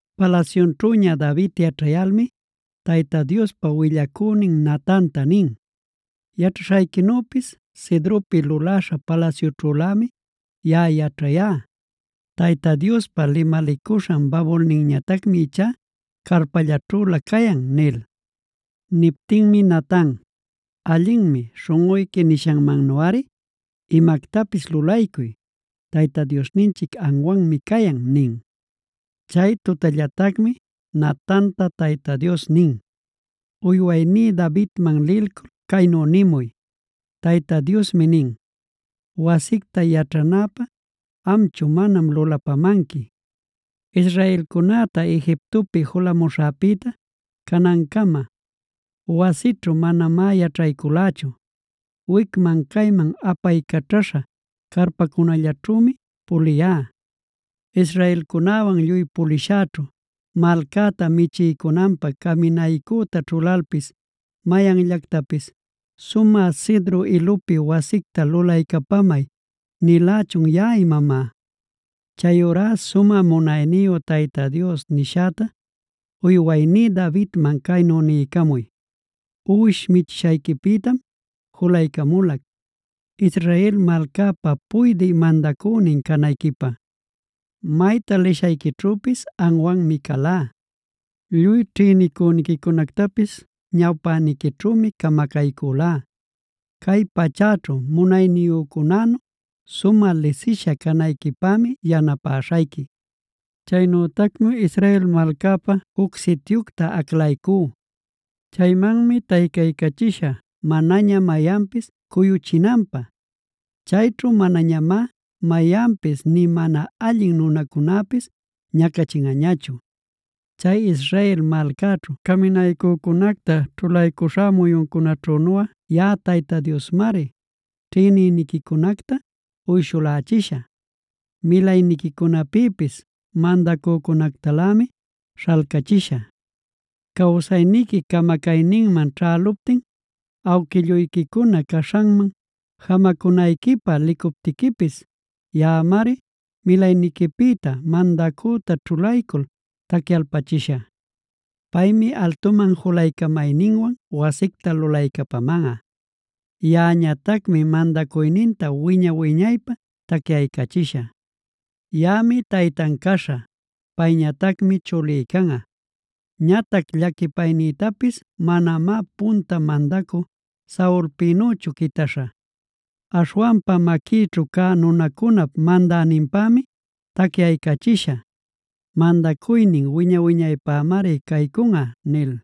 Palasyunćhüña David yaćhayalmi Tayta Diospa willacünin Natanta nin: “Yaćhaśhayquinüpis Cedropi luläśha palasyućhülämi yaꞌa yaćhayá. Tayta Diospa limalicuśhan babulninñatacmi ichá carpallaćhülä cayan” nil. Niptinmi Natan: “Allinmi, śhunꞌuyqui nishanmannuꞌari imactapis lulaycuy. Tayta Diosninchic anwanmi cayan” nin. Chay tutallatacmi Natanta Tayta Dios nin: “Uywayní Davidman lilcul caynu nimuy: ‘Tayta Diosmi nin: Wasicta yaćhanäpä amchu manam lulapamanqui. Israelcunäta Egiptopi julamuśhäpïta canancama, wasićhu manamá yaćhayculächu. Wicman cayman apaycaćhaśha carpacunallaćhümi puliyá. Israelcunäwan lluy pulishäćhu malcäta michiycunanpä caminaycüta ćhulalpis mayanllantapis “¿Sumä cedro ilupi wasicta lulaycapamay” nilächun yaꞌa imamá? Chayurá sumä munayniyu Tayta Dios nishäta uywayní Davidman caynu niycamuy: Uwish michishayquipïtam julaycamulac, Israel malcäpa puydï mandacünin canayquipä. Mayta lishayquićhüpis anwanmi calá. Lluy ćhïnicüniquicunactapis ñawpäniquićhümi camacaycülá. Cay pachäćhu munayniyücunänu sumä lisisha canayquipämi yanapäśhayqui. Chaynütacmi Israel malcäpä juc sityucta aclaycú. Chaymanmi taycaycachishä manaña mayanpis cuyuchinanpä. Chayćhu manañamá mayanpis nï mana allin nunacunäpis ñacachinꞌañachu, chay Israel malcäćhu caminaycücunacta ćhulaycuśhá muyuncunaćhunuꞌa. Yaꞌa Tayta Diosmari ćhïnicüniquicunacta uyshulächishä. Milayniquicunapïpis mandacücunactalämi śhalcachishä. Cawsayniqui camacayninman ćhäluptin, awquilluyquicuna caśhanman jamacunayquipä licuptiquipis, yaꞌamari milayniquipïta mandacüta ćhulaycul tacyalpachishä. Paymi altuman julaycamayninwan wasicta lulaycapamanꞌa. Yaꞌañatacmi mandacuyninta wiña-wiñaypä tacyaycachishä. Yaꞌami taytan caśhä. Payñatacmi chulí canꞌa.a Ñatac llaquipaynïtapis manamá punta mandacü Saulpïnüchu quitaśhä. Aśhwanpa maquïćhu cä nunäcunap mandäninpämi tacyaycachishä; mandacuynin wiña-wiñaypämari caycunꞌa’” nil.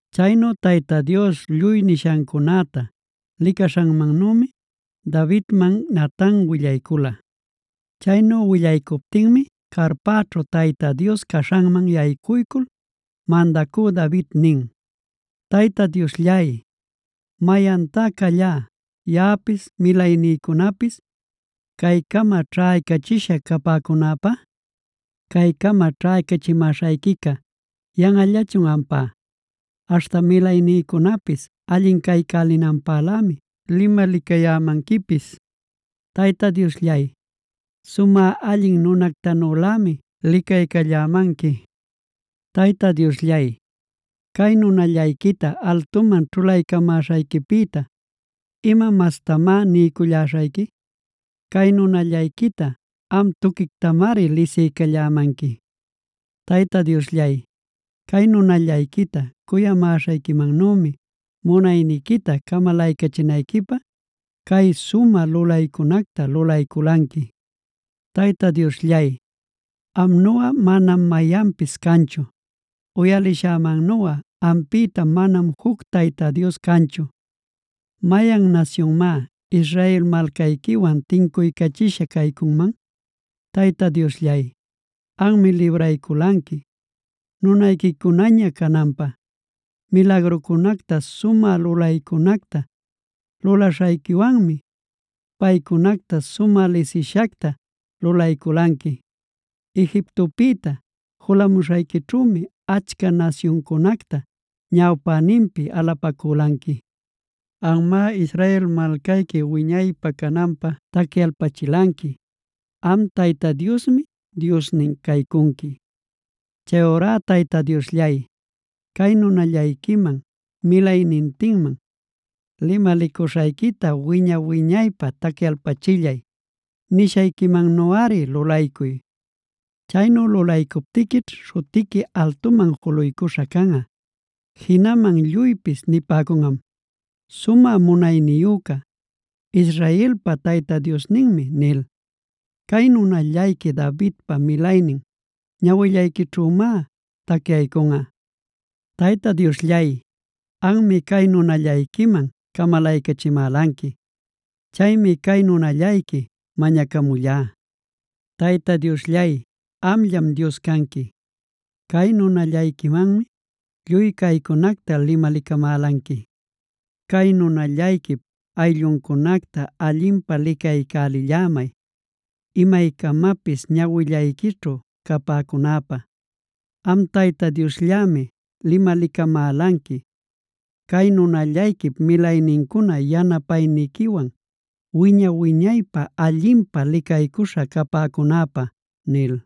Chaynu Tayta Dios lluy nishancunäta licaśhanmannümi Davidman Natan willaycula. Chaynu willaycuptinmi carpäćhu Tayta Dios caśhanman yaycuycul mandacü David nin: “Tayta Diosllay, ¿mayantá callá, yaꞌapis milaynïcunapis caycama ćhaycachisha capäcunäpä? Caycama ćhaycachimäśhayquica yanꞌallachun ampá; aśhta milaynïcunapis allin caycälinanpälämi limalicayämanquipis. Tayta Diosllay, sumä allin nunactanülämi licaycallämanqui. Tayta Diosllay, ¿cay nunallayquita altuman ćhulaycamäśhayquipïta ima mastamá niyculläśhayqui? Cay nunallayquita am tuquictamari lisiycallämanqui. Tayta Diosllay, cay nunallayquita cuyamäśhayquimannümi, munayniquita camalaycachinayquipä cay sumä lulaycunacta lulayculanqui. Tayta Diosllay, amnuꞌa manam mayanpis canchu. Uyalishämannuꞌa ampïta manam juc Tayta Dios canchu. ¿Mayan nasyunmá Israel malcayquiwan tincuycachisha caycunman? Tayta Diosllay, anmi librayculanqui nunayquicunaña cananpä. Milagrucunacta sumä lulaycunacta lulaśhayquiwanmi paycunacta sumä lisishacta lulayculanqui. Egiptopïta julamuśhayquićhümi achca nasyuncunacta ñawpäninpi alapacülanqui. Anmá Israel malcayqui wiñaypä cananpä tacyaycachilanqui; am Tayta Diosmi Diosnin caycunqui. “Chayurá Tayta Diosllay, cay nunallayquiman milaynintinman limalicuśhayquita wiña-wiñaypä tacyalpachillay. Nishayquimannuꞌari lulaycuy. Chaynu lulaycuptiquićh śhutiqui altuman juluycuśha canꞌa. Jinaman lluypis nipäcunꞌam: ‘¡Sumä munayniyüca, Israelpa Tayta Diosninmi!’ nil. Cay nunallayqui Davidpa milaynin, ñawillayquićhümá tacyaycunꞌa. “Tayta Diosllay, anmi cay nunallayquiman camalaycachimälanqui. Chaymi cay nunallayqui mañacamullá. Tayta Diosllay, amllam Dios canqui; cay nunallayquimanmi lluy caycunacta limalicamälanqui. Cay nunallayquip aylluncunacta allinpä licaycälillämay, imaycamapis ñawillayquićhu capäcunäpä. Am Tayta Diosllämi limalicamälanqui cay nunallayquip milaynincuna yanapayniquiwan, wiña-wiñaypä allinpä licaycuśhä capäcunäpä” nil.